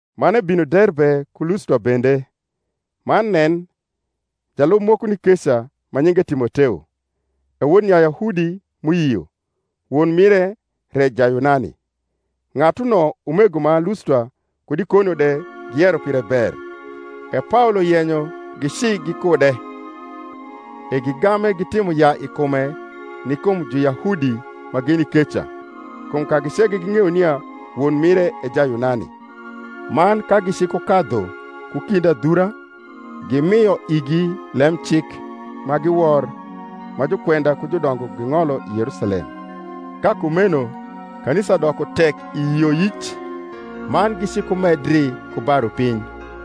Man ebino Derbe ku Lustra bende: man nen, jalub moko ni keca, ma nyinge Timoteo, e wod Nyayahudi m’uyio; won mire re Jayunani. Ng’atuno umego ma Lustra kud Ikonio de giyero pire ber. E Paolo yenyo gici gikude; e gigame gitimo yaa i kume ni kum Juyahudi ma gini keca: kum kagi ceke ging’eyo nia won mire e Jayunani. Man ka gicikukadhu ku kind adhura, gimio igi lem cik ma giwor ma jukwenda ku judongo ging’olo i Yerusalem. Ka kumeno kanisa doko tek i yioyic, man gicikumedri ku ba rupiny.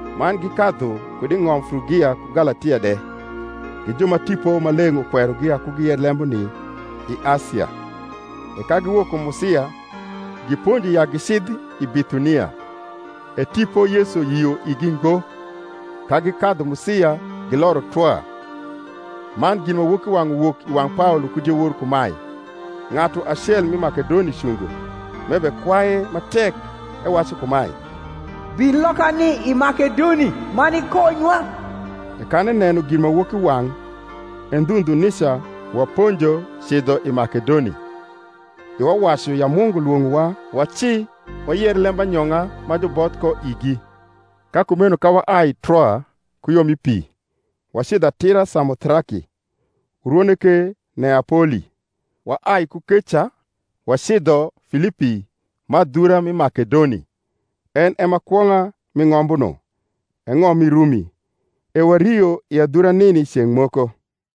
Man gikadhu kud i ng’om Frugia ku Galatia de, gi ju ma Tipo Maleng’ ukwerogi ya ku giyer lembuni i Asia; e ka giwok kum Musia, giponjo ya gicidh i Bithunia; e Tipo Yesu yio igi ngo; ka gikadhu Musia, giloro Troa. Man ginmawokiwang’ uwok i wang’ Paolo ku diewor kumae: Ng’atu acel m’i Makedoni cungo, m’ebekwaye ma tek, ewacu kumae, Bin lokani i Makedoni, man ikonywa. E kan eneno ginmawokiwang’, e ndhu ndhu nica waponjo cidho i Makedoni, iwa wacu ya Mungu lwong’owa waci wayer lembanyong’a ma juboth ko igi. Ka kumeno ka waai Troa ku yo mi pi, wacidho atira Samothraki, urwone ke Neapoli; waai ku keca wacidho Filipi, ma adhura mi Makedoni, en e ma kwong’a mi ng’ombuno, e ng’om mi Rumi; e wario i adhura nini ceng’ moko.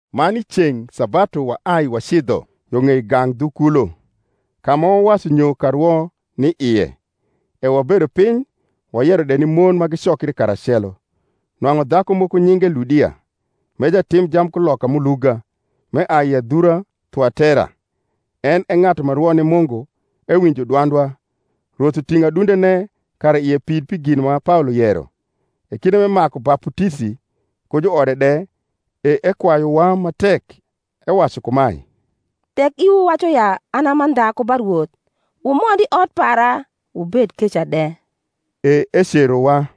Man i ceng’ sabatu wani wacidho yo ng’ei gang’ dhu kulo, ka ma wawacu nyo karwo ni ie; e wabedo piny wayero de ni mon ma gicokri karacelo. Nwang’u dhaku moko ma nyinge Ludia, m’e jatim jamkuloka m’uluga, m’eai i adhura Thuatera, en e ng’atu ma rwo ni Mungu, ewinjo dwandwa: Rwoth uting’o adundene kara ie pid pi gin ma Paolo yero. E kinde m’emaku baputisi, ku juode de, e ekwayuwa ma tek, ewacu kumae, Tek iwu wacu ya an a mandha ku ba Rwoth, wumond i ot para, wubed keca de. E ecerowa.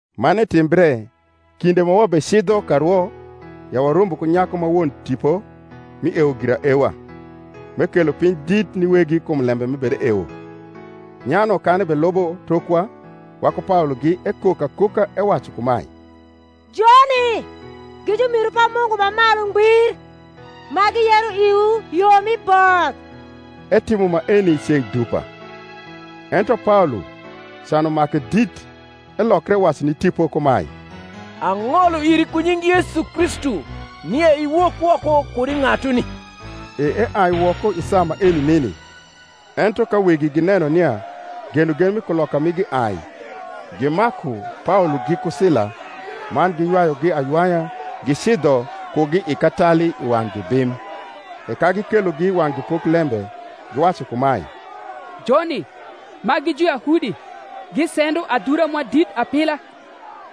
Man etimbre, kinde ma wabecidho karwo, ya warombo ku nyaku ma won tipo mi ewo giraewa, m’ekelo piny dit ni wegi kum lembe m’ebedeewo. Nyano kan ebelubo tokwa waku Paologi ekok akoka, ewacu kumae, Joni gi jumiru pa Mungu ma Malu Ngbir, ma giyero iwu yo mi both. Etimo maeni ceng’ dupa. Ento Paolo, can umake dit, elokre ewacu ni tipo kumae, Ang’olo iri ku nying Yesu Kristu nia iwok woko kud i ng’atuni. E eai woko i saa maeni nini. Ento ka wegi gineno nia genogen mi kuloka migi ai, gimaku Paolo giku Sila, man giywayugi aywaya gicidho kugi i katali i wang’ jubim, e ka gikelogi i wang’ jupoklembe, giwacu kumae, Joni, ma gi Juyahudi, gisendo adhura mwa dit apila.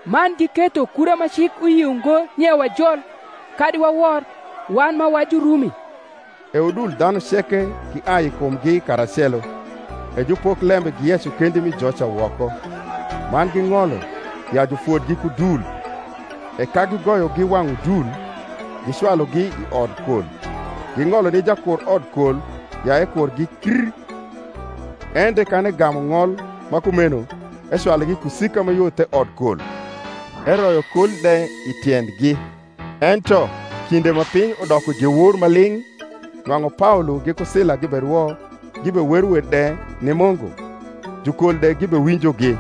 man giketho kura ma cik uyio ngo nia wajol, kadi wawor, wan ma wa Jurumi. E udul dhanu ceke giai i kumgi karacelo: e jupoklembe giyeco kendi mi joca woko, man ging’olo ya jufodgi ku dul. E ka gigoyogi wang’ udul, gicwalugi i odkol, ging’olo ni jakur odkol ya ekurgi kr: en de, kan egamu ng’ol ma kumeno, ecwalugi i kusika ma yo the odkol, eroyo kol de i tiendgi. Ento kinde ma piny udoko diewor ma ling’, nwang’u Paolo giku Sila giberwo gibewero wer de ni Mungu, jukol de gibewinjogi;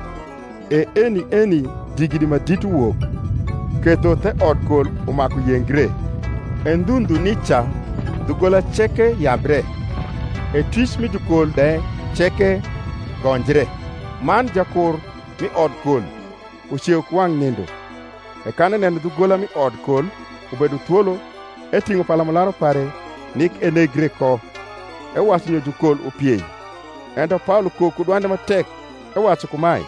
e eni eni digidi ma dit uwok, ketho the odkol umaku yengre: e ndhu ndhu nica dhugola ceke yabre; e twic mi jukol de ceke gonjre. Man jakur mi odkol, uceu ku wang’ nindo e kan eneno dhugola mi odkol ubedo thwolo, eting’o palamularu pare nik enegre ko, ewacu nyo jukol upiei. Ento Paolo kok ku dwande ma tek, ewacu kumae,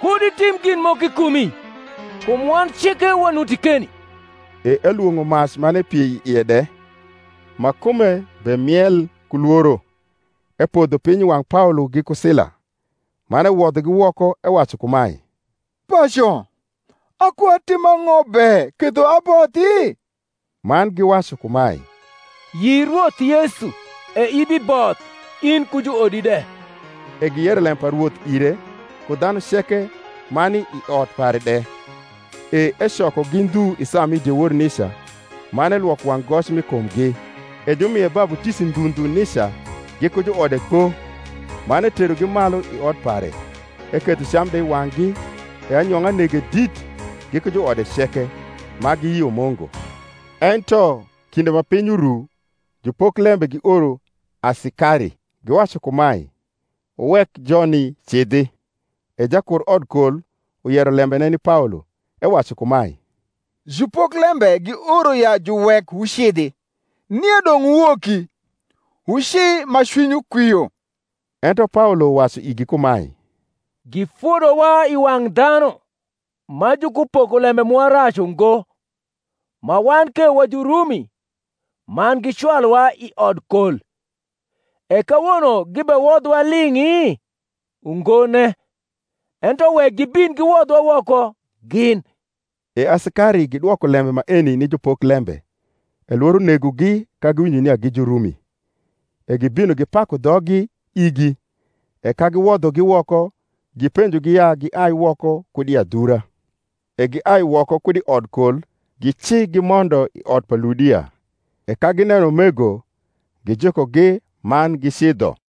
Kud itim gin moko i kumi: kum wan ceke wanuti keni. E elwong’o mac man epiei i ie de, ma kume bemiel ku lworo, epodho piny i wang’ Paolo giku Sila, man ewodhogi woko ewacu kumae, Paco, akoatim ang’o be ketho abothi? Man giwacu kumae, Yi Rwoth Yesu, e ibiboth. in ku juodi de. E giyero lembe pa Rwoth ire, ku dhanu ceke ma ni i ot pare de. E ecokogi ndhu i saa mi diewor nica, man elwoko wang’ goc mi kumgi; e jumie baputisi ndhu ndhu nica, giku juode kpo. Man eterogi malu i ot pare, eketho cam de i wang’gi, e anyong’a nege dit, giku juode ceke, ma giyio Mungu. Ento kinde ma piny uru, jupoklembe gioro asikari, giwacu kumae, Wuwek joni cidhi. E jakur odkol uyero lembene ni Paolo, ewacu kumae, Jupoklembe gioro ya juwek wucidhi: nie dong’ wuwoki, wuci ma cwinywu kwio. Ento Paolo wacu igi kumae, Gifodowa i wang’ dhanu, ma jukupoko lembe mwa rac ungo, ma wan ke wa Jurumi, man gicwaluwa i odkol; e kawono gibewodhowa ling’i? ungone; ento wek gibin giwodhwa woko gin. E asikari gidwoko lembe maeni ni jupoklembe: e lworo negogi ka giwinjo nia gi Jurumi; e gibino gipaku dhoggi igi; e ka giwodhogi woko, gipenjogi ya giai woko kud i adhura. E giai woko kud i odkol gici gimondo i ot pa Ludia: e ka gineno umego, gijukogi, man gicidho.